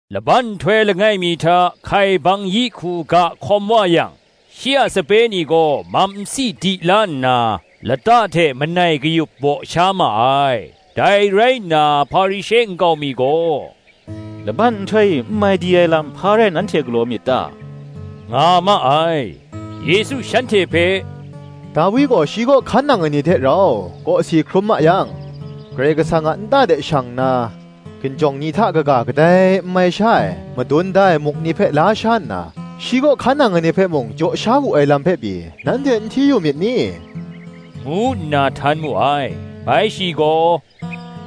Laban nhtoi langai mi hta hkaibang yi hku ga hkawm wa yang, shi a sape ni gaw mam nsi di la nna, lata hte manai kayup baw sha ma ai. Dai rai nna, Hparishe nkau mi gaw, “Laban nhtoi e n mai di ai lam, hpa rai nanhte galaw myit ta?” nga ma ai. Yesu shanhte hpe, “Dawi gaw, shi kaw hkan nang ai ni hte rau, kawsi hkrum ma yang, Karai Kasang a nta de shang nna, hkinjawng ni hta kaga, kadai n mai sha ai madun da ai muk ni hpe la sha nna, shi kaw hkan nang ai ni hpe mung jaw sha wu ai lam hpe pyi, nanhte n hti yu myit ni?” ngu nna htan mu ai. Bai shi gaw,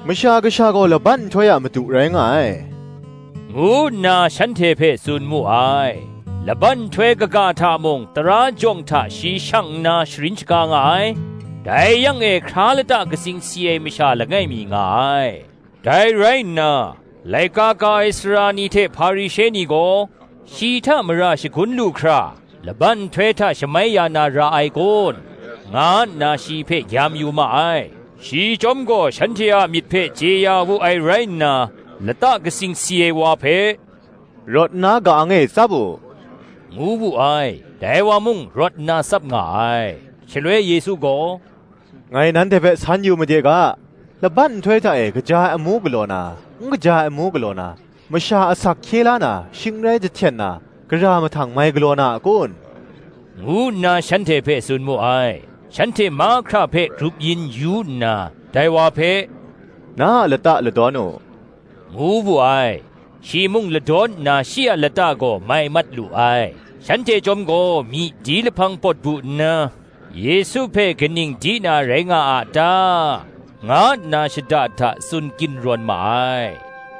“Masha Kasha gaw laban nhtoi a Madu rai nga ai,” ngu nna shanhte hpe tsun mu ai. Laban nhtoi kaga hta mung tara jawng hta shi shang nna sharin shaga nga ai: dai yang e hkra lata katsing si ai masha langai mi nga ai. Dai rai nna, laika ka ai sara ni hte Hparishe ni gaw, shi hta mara shagun lu hkra, “Laban nhtoi hta shamai ya na ra ai kun?” nga nna shi hpe gyam yu ma ai: Shi chyawm gaw shanhte a myit hpe chye ya wu ai rai nna, lata katsing si ai wa hpe, “Rawt nna ka-ang e tsap u,” ngu wu ai: dai wa mung rawt nna tsap nga ai. Shaloi Yesu gaw, “Ngai nanhte hpe san yu made ga, Laban nhtoi hta e kaja ai amu galaw na, n kaja ai amu galaw na; masha asak hkye la na, shing n rai jahten na, gara mahtang mai galaw na a kun?” ngu nna shanhte hpe tsun mu ai. Shanhte mahkra hpe grup yin yu nna, dai wa hpe, “Na a lata ladawn u,” ngu wu ai; shi mung ladawn nna shi a lata gaw mai mat lu ai. Shanhte chyawm gaw myi di lahpang pawt bu nna, “Yesu hpe kaning di na rai nga a ta?” nga nna shada da tsun ginrawn ma ai.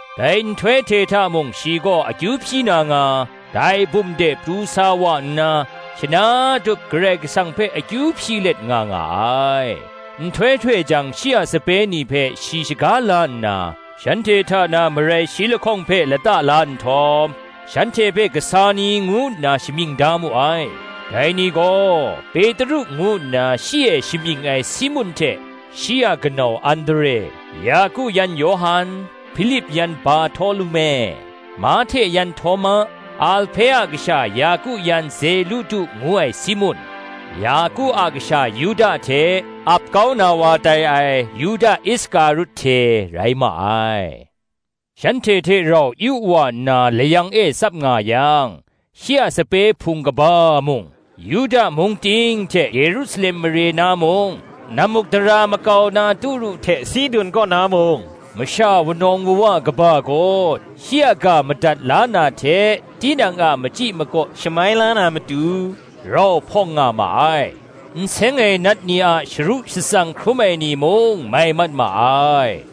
Dai nhtoi hte hta mung shi gaw akyu hpyi na nga, dai bum de pru sa wa nna, shana tup Karai Kasang hpe akyu hpyi let nga nga ai. Nhtoi htoi jang shi a sape ni hpe shi shaga la nna, shanhte hta na marai shi lahkawng hpe lata la nhtawm, shanhte hpe kasa ni ngu nna shamying da mu ai: dai ni gaw, Petru ngu nna shi e shamying ai Simun hte shi a kanau Andre; Yaku yan Yawhan; Hpilip yan Barhtolume; Mahte yan Htawma; Alhpe a kasha Yaku yan Zelutu ngu ai Simun; Yaku a kasha Yuda hte, ap kau na wa tai ai Yuda Iskarut hte rai ma ai. Shanhte hte rau yu wa nna layang e tsap nga yang, shi a sape hpung kaba mung, Yuda mung ting hte Yerusalem mare na mung, nammukdara makau na Turu hte Sidun kaw na mung, masha wunawng wuwa kaba gaw shi a ga madat la na hte tinang a machyi makaw shamai la na matu, rau hpawng nga ma ai: n seng ai nat ni a sharu shatsang hkrum ai ni mung mai mat ma ai.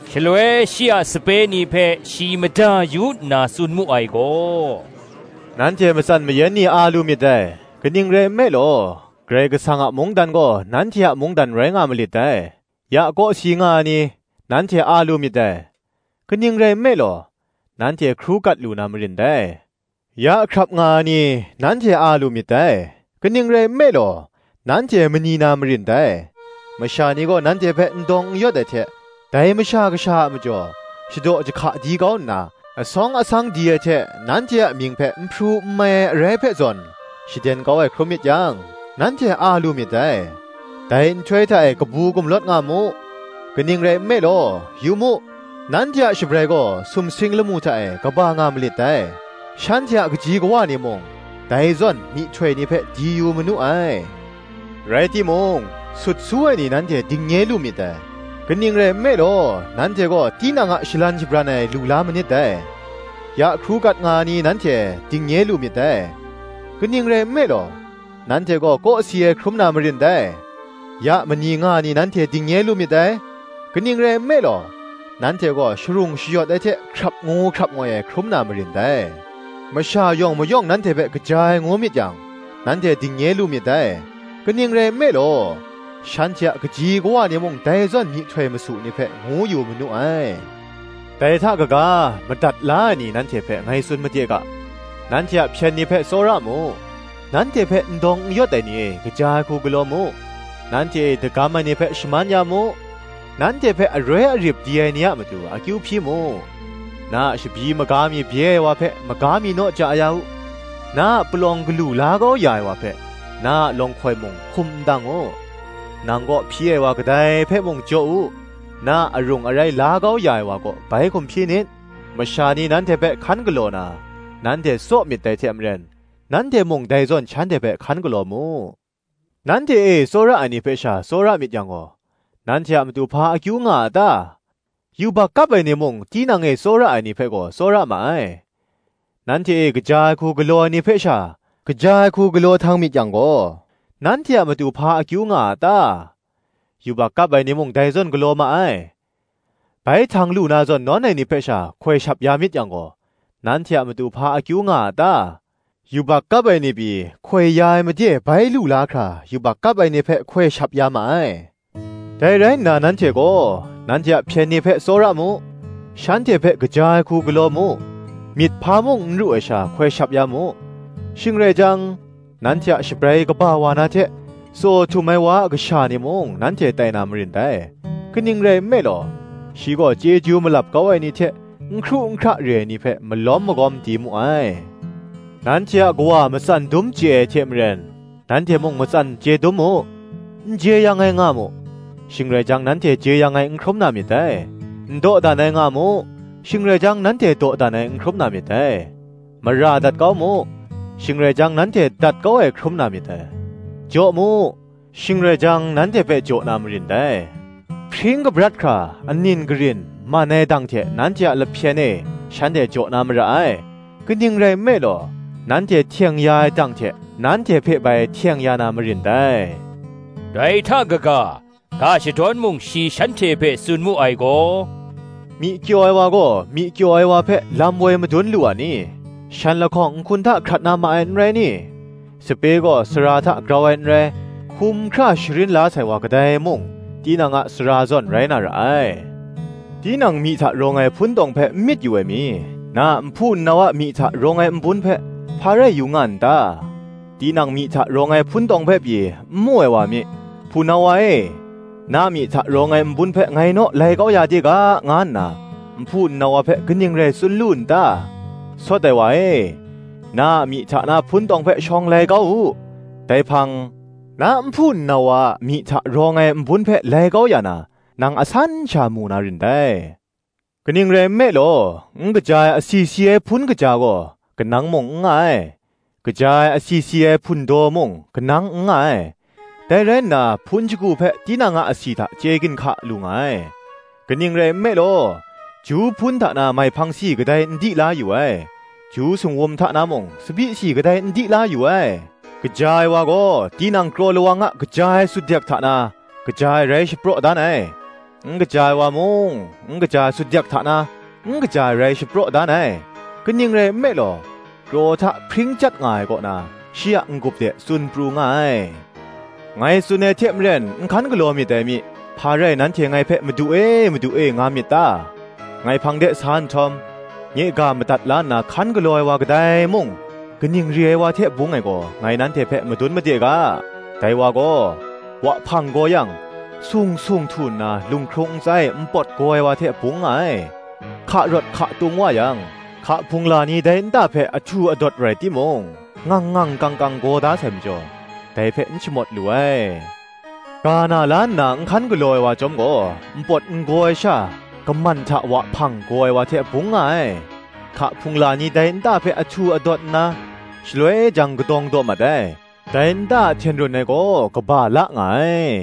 Shaloi shi a sape ni hpe shi mada yu nna tsun mu ai gaw: “Nanhte matsan mayan ni a lu myit dai: kaning rai nme law, Karai Kasang a mungdan gaw, nanhte a mungdan rai nga malit dai. Ya kawsi nga ai ni, nanhte a lu myit dai: kaning rai nme law, nanhte hkru kat lu na marin dai. Ya hkrap nga ai ni, nanhte a lu myit dai: kaning rai nme law, nanhte mani na marin dai. Masha ni gaw nanhte hpe n dawng n yawt ai hte, dai Masha Kasha a majaw shadaw jahka di kau nna, asawng asang di ai hte nanhte a mying hpe n hpru n mai ai arai hpe zawn shaden kau ai hkrum myit yang, nanhte a lu myit dai. Dai nhtoi hta e kabu gumlawt nga mu; kaning rai nme law, yu mu, nanhte a shabrai gaw sumsing lamu hta e kaba nga malit dai: shanhte a kaji kawa ni mung dai zawn myihtoi ni hpe di yu manu ai. “Rai timung, sut su ai ni nanhte dingnye lu myit dai: kaning rai nme law, nanhte gaw tinang a shalan shabran ai lu la manit dai. Ya hkru kat nga ai ni nanhte dingnye lu myit dai: kaning rai nme law, nanhte gaw kawsi ai hkrum na marin dai. Ya mani nga ai ni nanhte dingnye lu myit dai: kaning rai nme law, nanhte gaw sharung shayawt ai hte hkrap ngu hkrap ngoi ai hkrum na marin dai. Masha yawng mayawng nanhte hpe kaja ai ngu myit yang, nanhte dingnye lu myit dai: kaning rai nme law, shanhte a kaji kawa ni mung dai zawn myihtoi masu ni hpe ngu yu manu ai. Dai hta kaga, madat la ai ni nanhte hpe ngai tsun made ga, Nanhte a hpyen ni hpe tsawra mu; nanhte hpe n dawng n yawt ai ni e kaja ai hku galaw mu; nanhte e dagam ai ni hpe shaman ya mu; nanhte hpe aroi arip di ai ni a matu akyu hpyi mu. Na a shabyi maga mi bye ai wa hpe, maga mi naw ja ya u; na a palawng galu la kau ya ai wa hpe, na a lawnghkoi mung hkum ndang u. Nang kaw hpyi ai wa kadai hpe mung jaw u; na a arung arai la kau ya ai wa kaw bai hkum hpyi nit. Masha ni nanhte hpe hkan galaw na, nanhte tsaw myit dai hte maren, nanhte mung dai zawn shanhte hpe hkan galaw mu. Nanhte e tsawra ai ni hpe sha tsawra myit yang gaw, nanhte a matu hpa akyu nga a ta? yubak kap ai ni mung tinang e tsawra ai ni hpe gaw tsawra ma ai. Nanhte e kaja ai hku galaw ai ni hpe sha, kaja ai hku galaw htang myit yang gaw, nanhte a matu hpa akyu nga a ta? yubak kap ai ni mung dai zawn galaw ma ai. Bai htang lu na zawn nawn ai ni hpe sha hkoi shap ya myit yang gaw, nanhte a matu hpa akyu nga a ta? Yubak kap ai ni pyi, hkoi ya ai made bai lu la hkra yubak kap ai ni hpe hkoi shap ya ma ai. Dai rai nna nanhte gaw, nanhte a hpyen ni hpe tsawra mu; shanhte hpe kaja ai hku galaw mu; myit hpa mung n ru ai sha hkoi shap ya mu; shing rai jang, nanhte a shabrai kaba wa na hte, Tsaw htum ai wa a kasha ni mung nanhte tai na marin dai: kaning rai nme law, shi gaw chyeju malap kau ai ni hte, n hkru n hkra re ai ni hpe malawm magawm di mu ai. Nanhte a Kawa matsan dum chye ai hte maren, nanhte mung matsan chye dum mu. N jeyang ai nga mu; shing rai jang, nanhte jeyang ai n hkrum na myit dai: n dawdan ai nga mu; shing rai jang, nanhte dawdan ai n hkrum na myit dai: mara dat kau mu; shing rai jang, nanhte dat kau ai hkrum na myit dai. Jaw mu, shing rai jang, nanhte hpe jaw na marin dai: hpring kabrat hkra anin garin, man ai dang hte nanhte a lahpyen e shanhte jaw na mara ai: kaning rai nme law, nanhte hteng ya ai dang hte, nanhte hpe bai hteng ya na marin dai. Dai hta kaga, ga shadawn mung shi shanhte hpe tsun mu ai gaw, Myi kyaw ai wa gaw myi kyaw ai wa hpe lam woi madun lu a ni? shan lahkawng nhkun hta hkrat na ma ai, n rai ni? Sape gaw sara hta grau ai n rai: hkum hkra sharin la sai wa kadai mung, tinang a sara zawn rai na ra ai. Tinang myi hta rawng ai hpuntawng hpe n myit yu ai mi, na a nhpu nnau a myi hta rawng ai nbun hpe, hpa rai yu nga n ta? Tinang myi hta rawng ai hpuntawng hpe pyi, n mu ai wa mi, ‘Hpunau wa e, na myi hta rawng ai nbun hpe ngai naw lai kau ya de ga,’ nga nna nhpu nnau wa hpe kaning rai tsun lu n ta? Sawt ai wa e, na a myi hta na hpuntawng hpe shawng lai kau u; dai hpang, na nhpu nnau wa a myi hta rawng ai nbun hpe lai kau ya na, nang asan sha mu na rin dai. Kaning rai nme law, n kaja ai asi si ai hpun kaja gaw, kanang mung n nga ai; kaja ai asi si ai hpundaw mung, kanang n nga ai; dai rai nna hpun shagu hpe tinang a asi hta chye ginhka lu nga ai. Kaning rai nme law, ju hpun hta na maihpang si kadai n di la yu ai; ju singwum hta na mung tsabyi si kadai n di la yu ai. Kaja ai wa gaw, tinang kraw lawang a kaja ai sutdek hta na, kaja ai rai shapraw dan ai; n kaja ai wa mung n kaja ai sutdek hta na, n kaja ai rai shapraw dan ai: kaning rai nme law, kraw hta hpring chyat nga ai kaw na, shi a n-gup de tsun pru nga ai. Ngai tsun ai hte maren n hkan galaw myit dai mi, hpa rai nanhte ngai hpe, ‘Madu e, Madu e,’ nga myit ta? Ngai hpang de sa nhtawm, nye ga madat la nna hkan galaw ai wa kadai mung, kaning re ai wa hte bung ai gaw ngai nanhte hpe madun made ga: dai wa gaw, wahpang gaw yang, sung sung htu nna lunghkrung ntsa e npawt gaw ai wa hte bung nga ai: hka rawt hka tung wa yang, hka hpungla ni dai nta hpe ahtu adawt rai timung, ngang ngang kang kang gaw da sai majaw, dai hpe n shamawt lu ai. Ga na la nna n hkan galaw ai wa chyawm gaw, npawt n gaw ai sha, gaman hta wahpang gaw ai wa hte bung nga ai: hka hpungla ni dai nta hpe ahtu adawt nna, shaloi jang kadawng daw mat ai; dai nta a hten run ai gaw kaba la nga ai.